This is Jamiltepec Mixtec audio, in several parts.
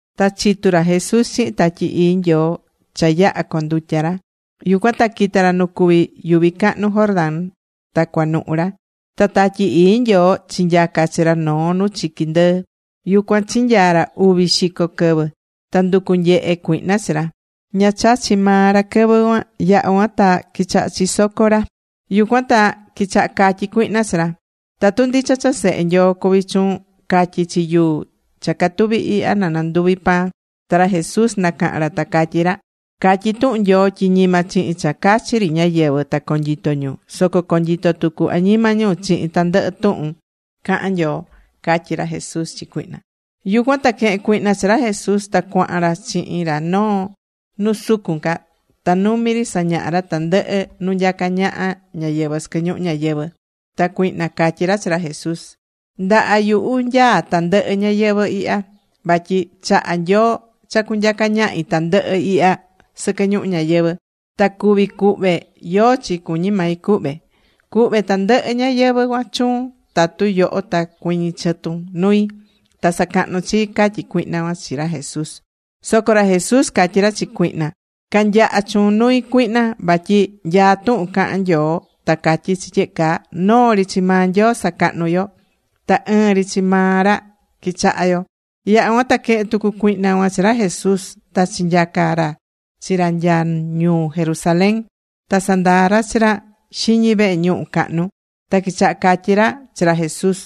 Ta chitú ra Jesús chihin Tatyi Ii Nyoo cha yaha̱ condutya ra. Yucuan ta quita̱ ra nu cuví yuvi cahnu Jordán ta cuanuhu ra. Ta Tatyi Ii Nyoo chinyaca̱ chi ra noo nu chiqui ndɨɨ. Yucuan chinyaa̱ ra uvi xico quɨvɨ. Ta nducú nyehe cuihna chi ra. Ña chachi̱ maa ra quɨvɨ cuan. Yaha̱ cuan ta quichaha chisoco ra. Yucuan ta quichaha catyí cuihna chi ra: ―Tatu ndicha cha Sehe Nyoo cuví chuun, ca̱tyi chi yuu cha catuví ihya, na nanduvi pan. Ta ra Jesús nacaha̱n ra, ta catyí ra: ―Catyí tuhun Nyoo tyi ñima chihin cha cachi ri ñáyɨvɨ ta conyito ñu. Soco conyitó tucu añima ñu chihin tandɨhɨ tuhun cahán Nyoo ―catyí ra Jesús chi cuihna. Yucuan ta quehe̱n cuihna chi ra Jesús. Ta cuahan ra chihin ra noo nu sucun ca. Ta numi ri sañaha̱ ra tandɨhɨ nu nyacá ñaha ñáyɨvɨ sɨquɨ ñuhu ñayɨvɨ̱. Ta cuihna catyí ra chi ra Jesús: ―Ndaha yuhu nyaá tandɨhɨ ñayɨvɨ̱ ihya. Vatyi chaha̱ Nyoo cha cunyaca ñahi tandɨhɨ ihya sɨquɨ ñuhu ñayɨvɨ. Ta cuví cuhve yóó chi cuñí mai cuhve. Cuhve tandɨhɨ ñayɨvɨ̱ cuan chuun tatu yoho ta cuɨñɨ chɨtun nui, ta sa̱cahnun chii ―catyí cuihna cuan chi ra Jesús. Soco ra Jesús catyí ra chi cuihna: ―Ca̱nyaha chuun nui, cuihna. Vatyi nyaá tuhun cahán Nyoo ta catyí chi tyehe caa: “Noo ri chi maa Nyoo sacahnu yo. Ta ɨɨn ri chi maa ra quichaha yo.” Yaha̱ cuan ta quehe̱n tucu cuihna cuan chi ra Jesús. Ta chinyaca̱ ra chi ra nya ñuu Jerusalén. Ta sandaa̱ ra chi ra xiñi vehe ñuhu cahnu. Ta quichaha catyí ra chi ra Jesús: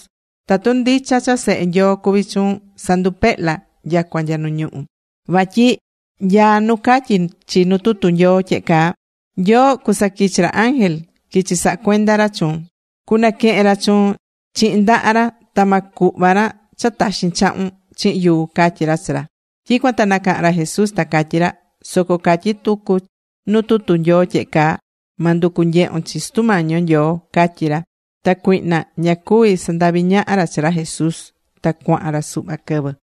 ―Tatu ndicha cha Sehe Nyoo cuví chuun, sa̱ndupehla nyacua nya nu ñuhú. Vatyi nyaá nu catyí chi nu tutu Nyoo tyehe caa: Nyoo cusaquichi ra ángel, quichi saha cuenda chuun. Cunaquehen ra chuun chihin ndaha ra. Ta ma cuhva ra cha taxin chahun chihin yuu ―catyí ra chi ra. Tyicuan ta nacaha̱n ra Jesús, ta catyí ra: ―Soco catyí tucu nu tutu Nyoo tyehe caa: “Ma nducu nyehun chi Sutu Mañi yo Nyoo”, ―catyí ra. Ta cuihna ña cuvi̱ sandahvi ñaha ra chi ra Jesús. Ta cuahan ra suhva quɨvɨ.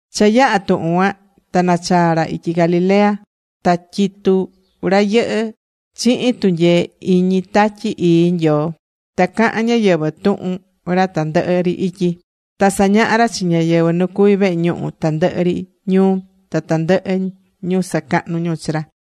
Cha yaha̱ tuhun cuan, ta nachaa̱ ra ityi Galilea. Ta tyitú ra yɨhɨ́ chihin tunyee iñi Tatyi Ii Nyoo. Ta cahán ñáyɨvɨ tuhun ra tandɨhɨ ri ityi. Ta sañahá ra chi ñáyɨvɨ nu cuví vehe ñuhu tandɨhɨ ri ñuu. Ta tandɨhɨ ñu sacahnú ñu chi ra.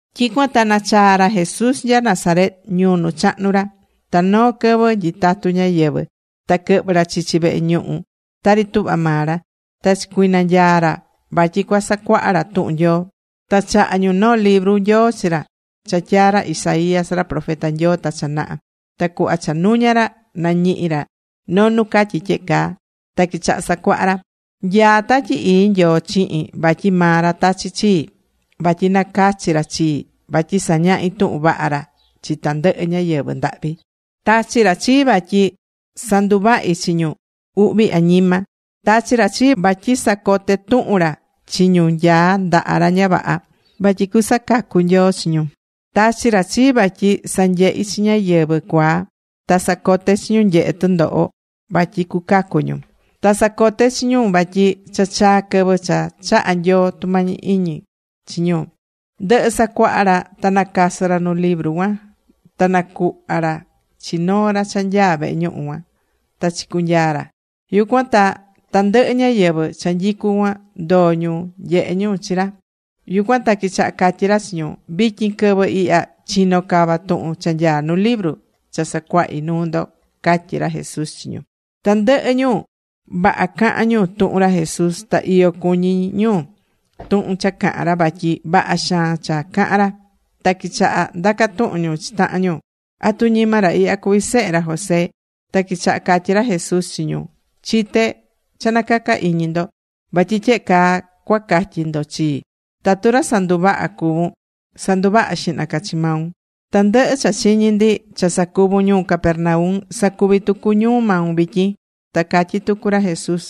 Tyicuan ta nachaa̱ ra Jesús nya Nazaret, ñuu nu chahnu̱ ra. Ta noo quɨvɨ nyitatú ñáyɨvɨ, ta quɨhvɨ̱ ra chichi vehe ñuhu, tari tuhva maa ra. Ta chicunanyaa̱ ra vatyi cua sacuaha ra tuhun Nyoo. Ta chaha̱ ñu noo libru Nyoo chi ra cha tyaa̱ ra Isaías ra profeta Nyoo ta cha naha. Ta cuhva cha nuña̱ ra, nañihi̱ ra noo nu catyí tyehe caa. Ta quichaha̱ sacuaha ra: Nyaá Tatyi Ii Nyoo chihin vatyi maa ra tachi̱ chii. Vatyi nacachi̱ ra chii vatyi sañahi tuhun vaha ra chi tandɨhɨ ñáyɨvɨ ndahvi. Tachi̱ ra chii vatyi sanduvahi chi ñu uhvi añima. Tachi̱ ra chii vatyi sacote tuhun ra chi ñu nyaá ndaha ra ña vaha, vatyi cusacacu Nyoo chi ñu. Tachi̱ ra chii vatyi sanyehi chi ñáyɨvɨ cuaa. Ta sacote chi ñu nyehe tɨndoho vatyi cucacu ñu. Ta sacote chi ñu vatyi cha chaa̱ quɨvɨ cha chaha̱ Nyoo tumañi iñi chi ñu. Ndɨhɨ̱ sacuaha ra ta nacasɨ̱ ra nu libru cuan. Ta nacuhva̱ ra chi noo ra cha nyaá vehe ñuhu cuan. Ta chicunyaa̱ ra. Yucuan ta tandɨhɨ ñáyɨvɨ cha nyicú cuan ndoo̱ ñu nyehe ñu chi ra. Yucuan ta quichaha catyí ra chi ñu: ―Vityin quɨvɨ ihya chino̱ cava tuhun cha nyaá nu libru cha sacuahi̱ nuu ndo ―catyí ra Jesús chi ñu. Tandɨhɨ ñu, vaha cahán ñu tuhun ra Jesús. Ta iyo cuñí ñu tuhun cha cahán ra vatyi vaha xaan cha cahán ra. Ta quichaha ndaca tuhun ñu chi tahan ñu: ―¿Atu ñima ra ihya cuví sehe ra José? Ta quichaha catyí ra Jesús chi ñu: ―Chité cha nacacá iñi ndo. Vatyi tyehe caa cua catyi ndo chii: “Tatu ra sanduvahá cuvún, sa̱nduvaha xihna ca chi maun. Tandɨhɨ cha chiñi̱ ndi cha sacuvu̱n ñuu Capernaum. Sa̱cuvi tucu ñuu maun vityin.” Ta catyí tucu ra Jesús: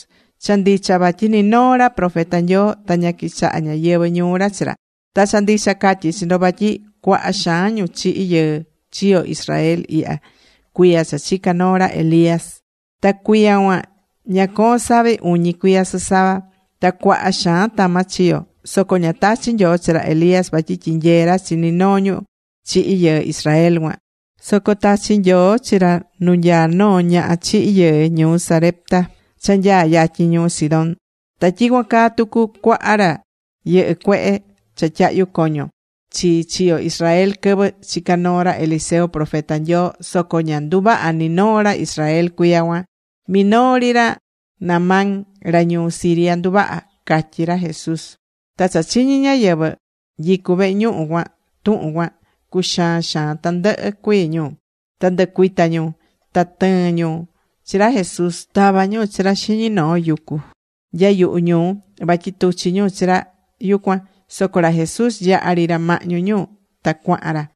―Cha ndicha vatyi ni noo ra profeta Nyoo, ta ña quichaha ñáyɨvɨ ñuu ra chi ra. Ta cha ndicha catyí chi ndo vatyi cuaha xaan ñu chihi̱ yɨɨ chiyo̱ Israel ihya cuiya cha chica̱ noo ra Elías. Ta cuiya cuan ña coo̱n savi uñi cuiya sɨsava. Ta cuaha xaan tama chiyo̱. Soco ña tachi̱ Nyoo chi ra Elías vatyi tyinyee ra chi ni noo ñu chihi̱ yɨɨ Israel cuan. Soco tachi̱ Nyoo chi ra nu nyaá noo ñaha chihi̱ yɨɨ ñuu Sarepta cha nyaá yatyin ñuu Sidón. ’Ta tyicuan caa tucu cuaha ra yɨhɨ́ cuehe cha tyahyu coño chi chiyo̱ Israel quɨvɨ chica̱ noo ra Eliseo, profeta Nyoo. Soco ña nduvaha̱ ni noo ra Israel cuiya cuan. Minoo ri ra Naamán ra ñuu Siria nduvaha̱ ―catyí ra Jesús. Ta cha chiñi̱ ñáyɨvɨ nyicú vehe ñuhu cuan tuhun cuan, cuxaan xaan tandɨhɨ cuii ñu. Ta nducuita ñu. Ta tɨɨ̱n ñu chi ra Jesús. Tava̱ ñu chi ra xiñi noo yucu nya yuhu ñuu, vatyi tuchi ñu chi ra yucuan. Soco ra Jesús yaha̱ ri ra mahñu ñu ta cuahan ra.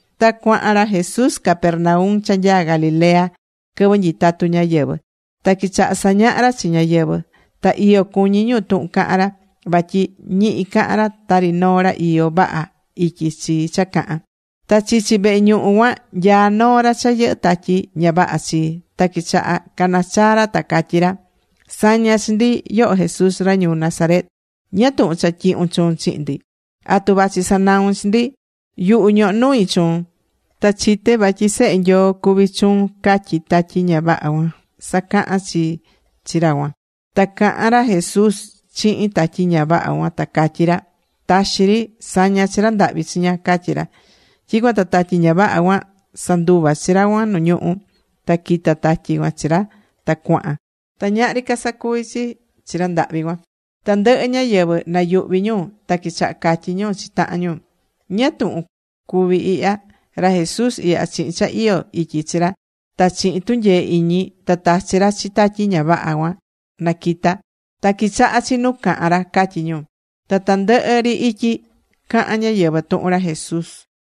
Ta cuahan ra Jesús Capernaum cha nyaa Galilea quɨvɨ nyitatú ñáyɨvɨ. Ta quichaha sañaha ra chi ñáyɨvɨ. Ta iyo cuñí ñu tuhun cahán ra. Vatyi ñihi cahán ra tari noo ra iyó vaha ityi chi cha cahán. Ta chichi vehe ñuhu cuan nyaá noo ra cha yɨhɨ́ tatyi ña vaha chi. Ta quichaha canachaa ra, ta catyí ra: ―Sa̱ña chi ndi, yoho Jesús ra ñuu Nazaret. ¿Ñáá tuhun cha tyihun chuun chihin ndi? ¿Atu vachi sanaun chi ndi? Yuhu, ñohó nui chuun. Ta chité vatyi Sehe Nyoo cuví chuun ―catyí tatyi ña vaha cuan sacahan chi chi ra cuan. Ta cahan ra Jesús chihin tatyi ña vaha cuan, ta catyí ra: ―Ta̱xi ri. Sa̱ña chi ra ndahvi chiña ―catyí ra. Tyicuan ta tatyi ña vaha cuan sanduva̱ chi ra cuan nu ñuhú. Ta quita̱ tatyi cuan chi ra ta cuahan. Ta ñahri ca sacuvi chi chi ra ndahvi cuan. Tandɨhɨ ñáyɨvɨ nayuhvi̱ ñu. Ta quichaha catyí ñu chi tahan ñu: ―¿Ñáá túhun cuví ihya? Ra Jesús ihya chihin cha iyó ityi chi ra ta chihin tunyee iñi ta tachi ra chi tatyi ña vaha cuan na quita. Ta quichaha chi nu cahán ra ―catyí ñu. Ta tandɨhɨ ri ityi cahán ñáyɨvɨ tuhun ra Jesús.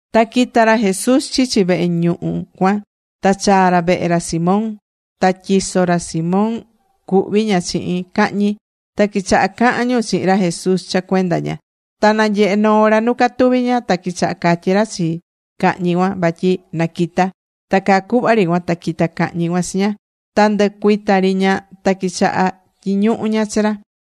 Ta quita̱ ra Jesús chichi vehe ñuhu cuan. Ta chaa̱ ra vehe ra Simón. Ta tyiso ra Simón cuhví ña chihin cahñi. Ta quichaha cahán ñu chihin ra Jesús cha cuenda ña. Ta nanyehe noo ra nu catuví ña. Ta quichaha catyí ra chi cahñi cuan vatyi na quita. Ta caa cuhva ri cuan ta quita cahñi cuan chi ña. Ta nducuita ri ña. Ta quichaha tyiñuhu ña chi ra.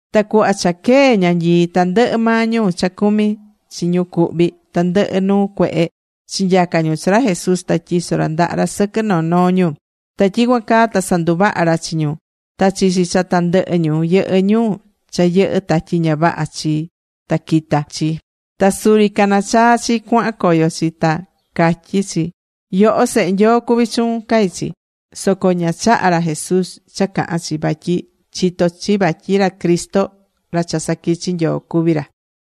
Ta cuhva cha quee ñanyii, tandɨhɨ maa ñu cha cumí chi ñu cuhví tandɨhɨ nuu cuehe, chinyaca̱ ñu chi ra Jesús. Ta tyiso̱ ra ndaha ra sɨquɨ noo noo ñu. Ta tyicuan caa ta sanduvaha̱ ra chi ñu. Ta chichi cha tandɨhɨ ñu yɨhɨ́ ñu cha yɨhɨ́ tatyi ña vaha chi, ta quita̱ chi. Ta suri cana chaa chi cuahan coyo chi, ta catyí chi: ―Yoho Sehe Nyoo cuví chuun ―catyí chi. Soco ña chaha̱ ca ra Jesús cha cahan chi. Vatyi chitó chi vatyi ra Cristo, ra cha saquichi̱ Nyoo cuví ra.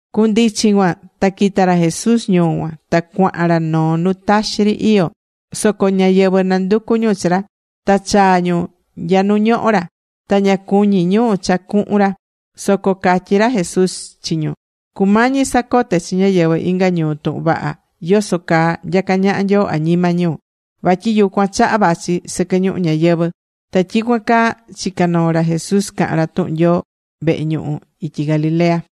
Cundichin cuan ta quita̱ ra Jesús ñuu cuan. Ta cuahan ra noo nu taxi ri iyó. Soco ñáyɨvɨ nanducu̱ ñu chi ra. Ta chaa̱ ñu nya nu ñohó ra. Ta ña cuñí ñu cha cuhun ra. Soco catyí ra Jesús chi ñu: ―Cumañi sacote chi ñáyɨvɨ inga ñuu tuhun vaha yoso caa nyacá ñaha Nyoo añima ñu. Vatyi yucuan chaha vachi sɨquɨ ñuhu ñayɨvɨ̱. Ta tyicuan caa chicá noo ra Jesús cahán ra tuhun Nyoo vehe ñuhu ityi Galilea.